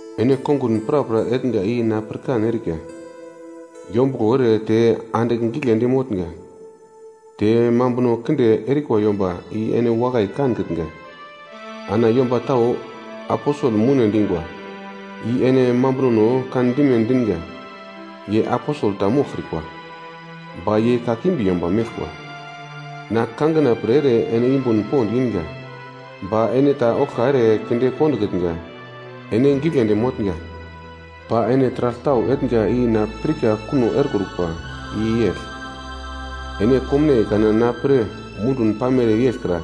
Ene kongun prapra etnga i na pirkan erika; yombuglo ere te andigl giglendi motnga, te mambuno kinde erikwa yomba i ene wakai kankitnga, ana yomba tau aposel moune dingwa i ene mambunono kandime dinga ye aposel ta moglkrikwa, ba ye kakimbi yomba meglkwa. Na kangina pre ere ene yumbun pond inga, ba ene ta oglka ere kinde kondokitnga. Ene giglendi motnga. Ba ene taragl tau etnga i na pirka kuno erekrukwa i yegl. Ene komnaiye kana na pre mundun pamere yeglkra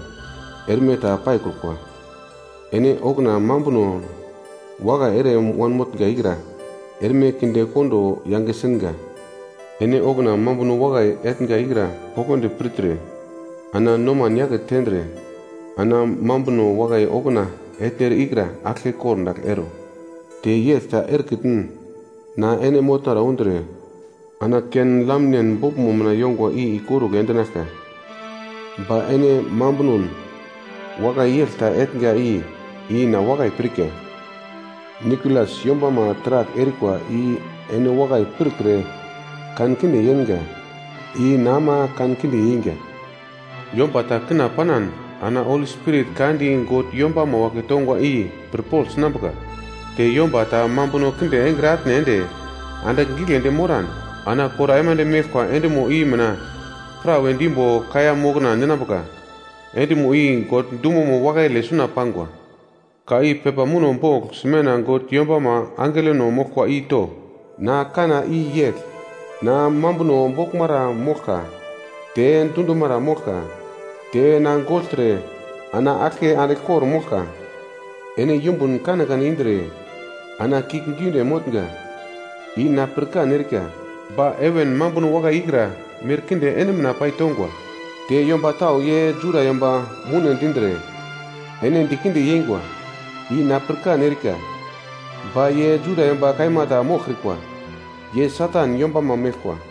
erme ta paikrukwa. Ene okuna mambuno wakai ere wanmotnga ikra erme kindekondo yange singa. Ene okuna mambuno wakai etnga ikra poglodi pirtre ana noman yake tendre, ana mambuno wakai okuna etnere ikra aglke kordagl ero. Te yegl ta erekitn na ene motnara undre, ana ken lamnen boglmo mina yongwa i ikorugl endinaglka. Ba ene mambunon wakai yegl ta etnga i ina wakai pirka: Nikolas yombama taragl erikwa i ene wakai pirkre kankinde yenga. I na ama kankinde yeinga. Yomba ta kina panan ana Holi Spirit ka di God yombama wagle tongwa i pirpogl sinambuka. Te yomba ta mambuno kinde engre atne ende andigl giglendi moran ana kor aimande meglkwa endimo i mina prawe dimbo kaiya mokna ninambuka, endimo i God dumomo wakaile suna pangwa. “Ka i pepa muno bogl Smena God yombama angelono moglkwa i to: Na kanna i yegl: Na mambuno boglmara moglka te dundumara moglka, te na gogltre ana aglke andigl kor-moglka. Ene yumbun kanekane indre ana kiuglgiunde motnga i na pirkan erika. Ba heven mambuno wakai ikra merkinde ene mina paitongwa. Te yomba tau ye Juda yomba moune dindre, ene dikinde yeingwa i na pirkan erika. Ba ye Juda yomba kaima ta moglkrikwa, ye Satan yombama meglkwa.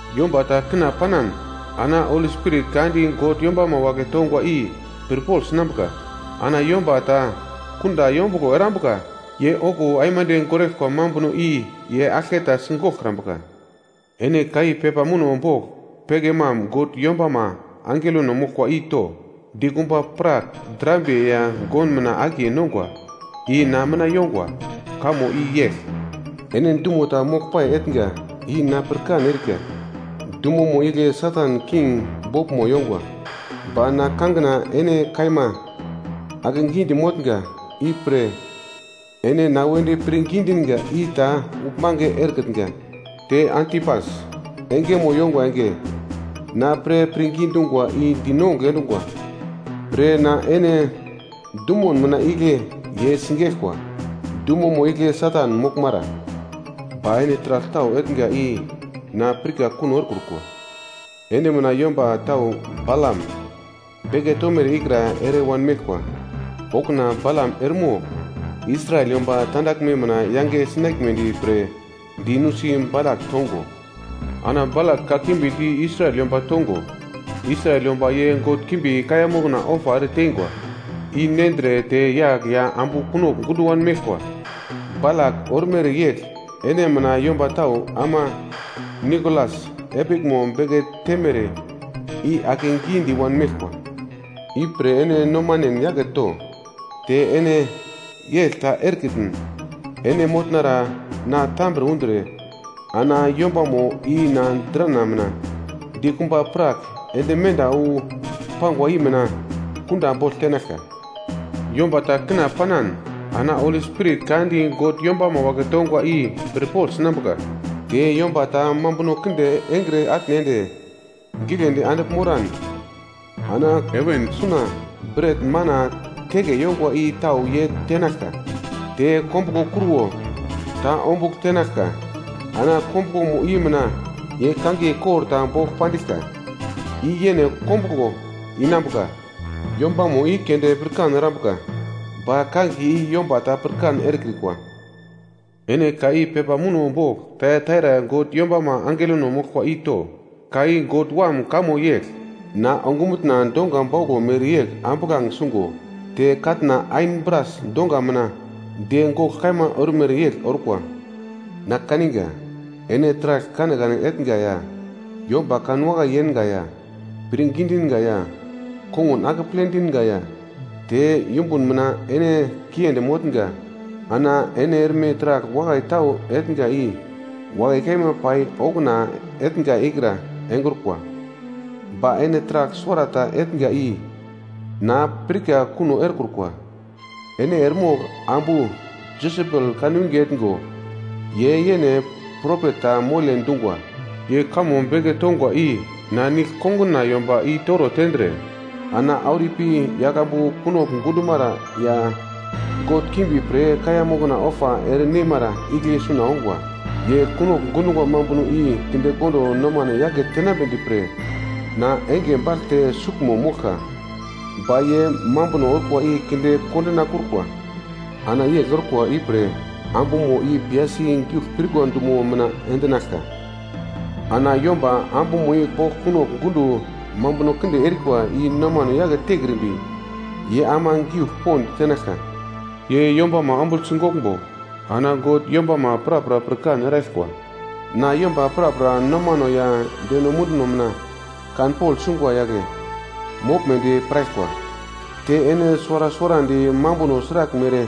Yomba ta kina panan ana Holi Spirit ka di God yombama wagle tongwa i pirpogl sinambuka. Ana yomba ta kunda yombuglo erambuka ye okuwo aimande goraglkwa mambuno i ye aglke ta sigoglkrambuka. “Ene ka i pepa muno bogl Pergamam God yombama angelono moglkwa i to: Dikumba prak drambiye ya gon mina akiye nongwa i na mina yongwa. Kamo i yegl: Ene dumo ta moglpai etnga i na pirkan erika. Dumomo igle Satan king boglmo yongwa. Ba na kangina ene kaima akegidi motnga, ipre ene na wedi pirngi dinga i ta uglmange erekitnga. Te Antipas engemo yongwa enge na pre pirngi dungwa i dinongugl endungwa pre ana ene dumun mina igle ye sigeglkwa, dumomo igle Satan moglmara. Ba ene taragl tau etnga i na pirka kuno erekrukwa. Ene mina yomba tau Balam beke tomere ikra ere wanmeglkwa. Okuna Balam eremogl Israel yomba tandaglme mina yange sinaglmedi pre di nusi Balak tongo, ana Balak kakimbi di Israel yomba tongo Israel yomba ye god kimbi kaiya mokna ofa ereteingwa i nendre te yagl ya ambu kunogl gundo wanmeglkwa. Balak ormere yegl ene mina yomba tau ama Nikolas epiglmo beke temere i akegidi i-wanmeglkwa. Ipre ene nomanen yake to! Te ene yegl ta erekitn ene motnara na tambre undre, ana yombamo i na drana mina dikumba prak ende menda wu pangwa i mina kunda bogl tenaglka. Yomba ta kina panan ana Holi Spirit ka di God yombama wagle tongwa i pirpogl sinambuka. Te yomba ta mambuno kinde engre atne ende giglendi andigl moran ana heven suna bret-mana teke yongwa i tau ye tenaglka. Te kombuglo kruwo ta ombugl tenaglka. Ana kombuglomo i mina ye kangiye kor ta bogl pandiglka i yene kombuglo inambuka yombamo i keunde pirkan erambuka. Ba kangiye i yomba ta pirkan erekrikwa. “Ene ka i pepa muno bogl Taiataira God yombama angelono moglkwa i to: Ka i God Wam kamo yegl: Na ongumutna donga bauglo mereyegl ambuglange sungo te katna ain bras donga mina de gogl kaima ormere yegl orkwa. Na kaniga, ene taragl kanekane etnga ya yomba kanwakai yenga ya pirngi dinga ya kongun akeple dinga ya te yumbun mina ene kiendi motnga. Ana ene erme taragl wakai tau etnga i wakai kaima pai okuna etnga ikra engrukwa. Ba ene taragl suwarata etnga i na pirka kuno erekrukwa. Ene eremogl ambu Jesebel kanwinge etngo ye yene propet ta mole dungwa. Ye kamo beke tongwa i na nigl konguna yomba i-toro tendre ana auro ipi yaglambu kunogl gundumara ya god kimbi pre kaiya mokna ofa ere neimara igle suna ongwa. Ye kunogl gundungwa mambuno i kindekondo nomane yake tenambedi pre na enge bagl te suglmo moglka, ba ye mambuno orkwa i kinde kondinakrukwa. Ana yegl orkwa ipre ambumo i piyasi giugl pirkwa dumo mina endinaglka. Ana yomba ambumo i bogl kunogl gundo mambuno kinde erikwa i nomano yake tekrimbi ye ama giugl pond tenaglka. Ye yombama ombugl sigoglmbo ana God yombama prapra pirkan eraglkwa, na yomba prapra nomano ya deno munduno mina kanpogl sungwa yagle moglmedi piraglkwa. Te ene suwara suwarandi mambuno sraglmere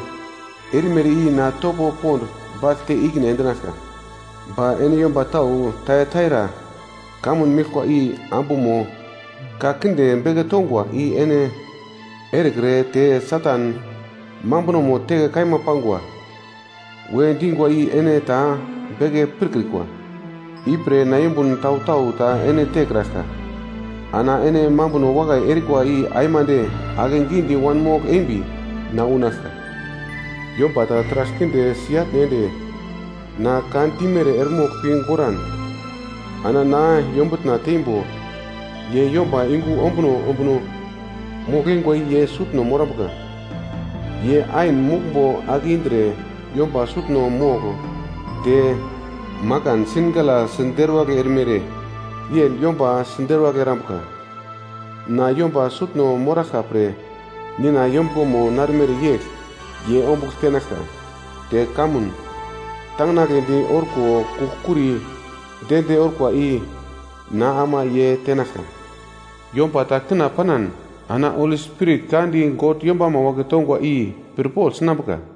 erimere i na topo pond bagl te ikine endinaglka. Ba ene yomba tau Taiataira kamun meglkwa i ambumo ka kinde beke tongwa i ene erekre te ‘Satan mambunomo teke kaima pangwa,’ we dingwa i ene ta beke pirkrikwa. Ipre na yumbun tau-tau ta ene tekraglka. Ana ene mambuno wakai erikwa i aimande akegidi wanmogl embi na unaglka. Yomba ta taragl kinde si-atne ende na ka dimere eremogl pi goran ana na yombutna teimbo ye yomba yungu ombuno ombuno mogl-eingwa i ye sutno morambuka. ‘Ye ain muglmbo ake indre yomba sutno mogl te makansingala siderwagl erimere yegl yomba siderwagl erambuka.’ Na yomba sutno moraglka pre Nina yombuglomo narmere yegl ye ombugl tenaglka. Te kamun tanginagledi orko kugl-kuri de-de orkwa i na ama ye tenaglka. Yomba ta kina panan ana Holi Spirit ka di God yombama wagle tongwa i pirpogl sinambuka.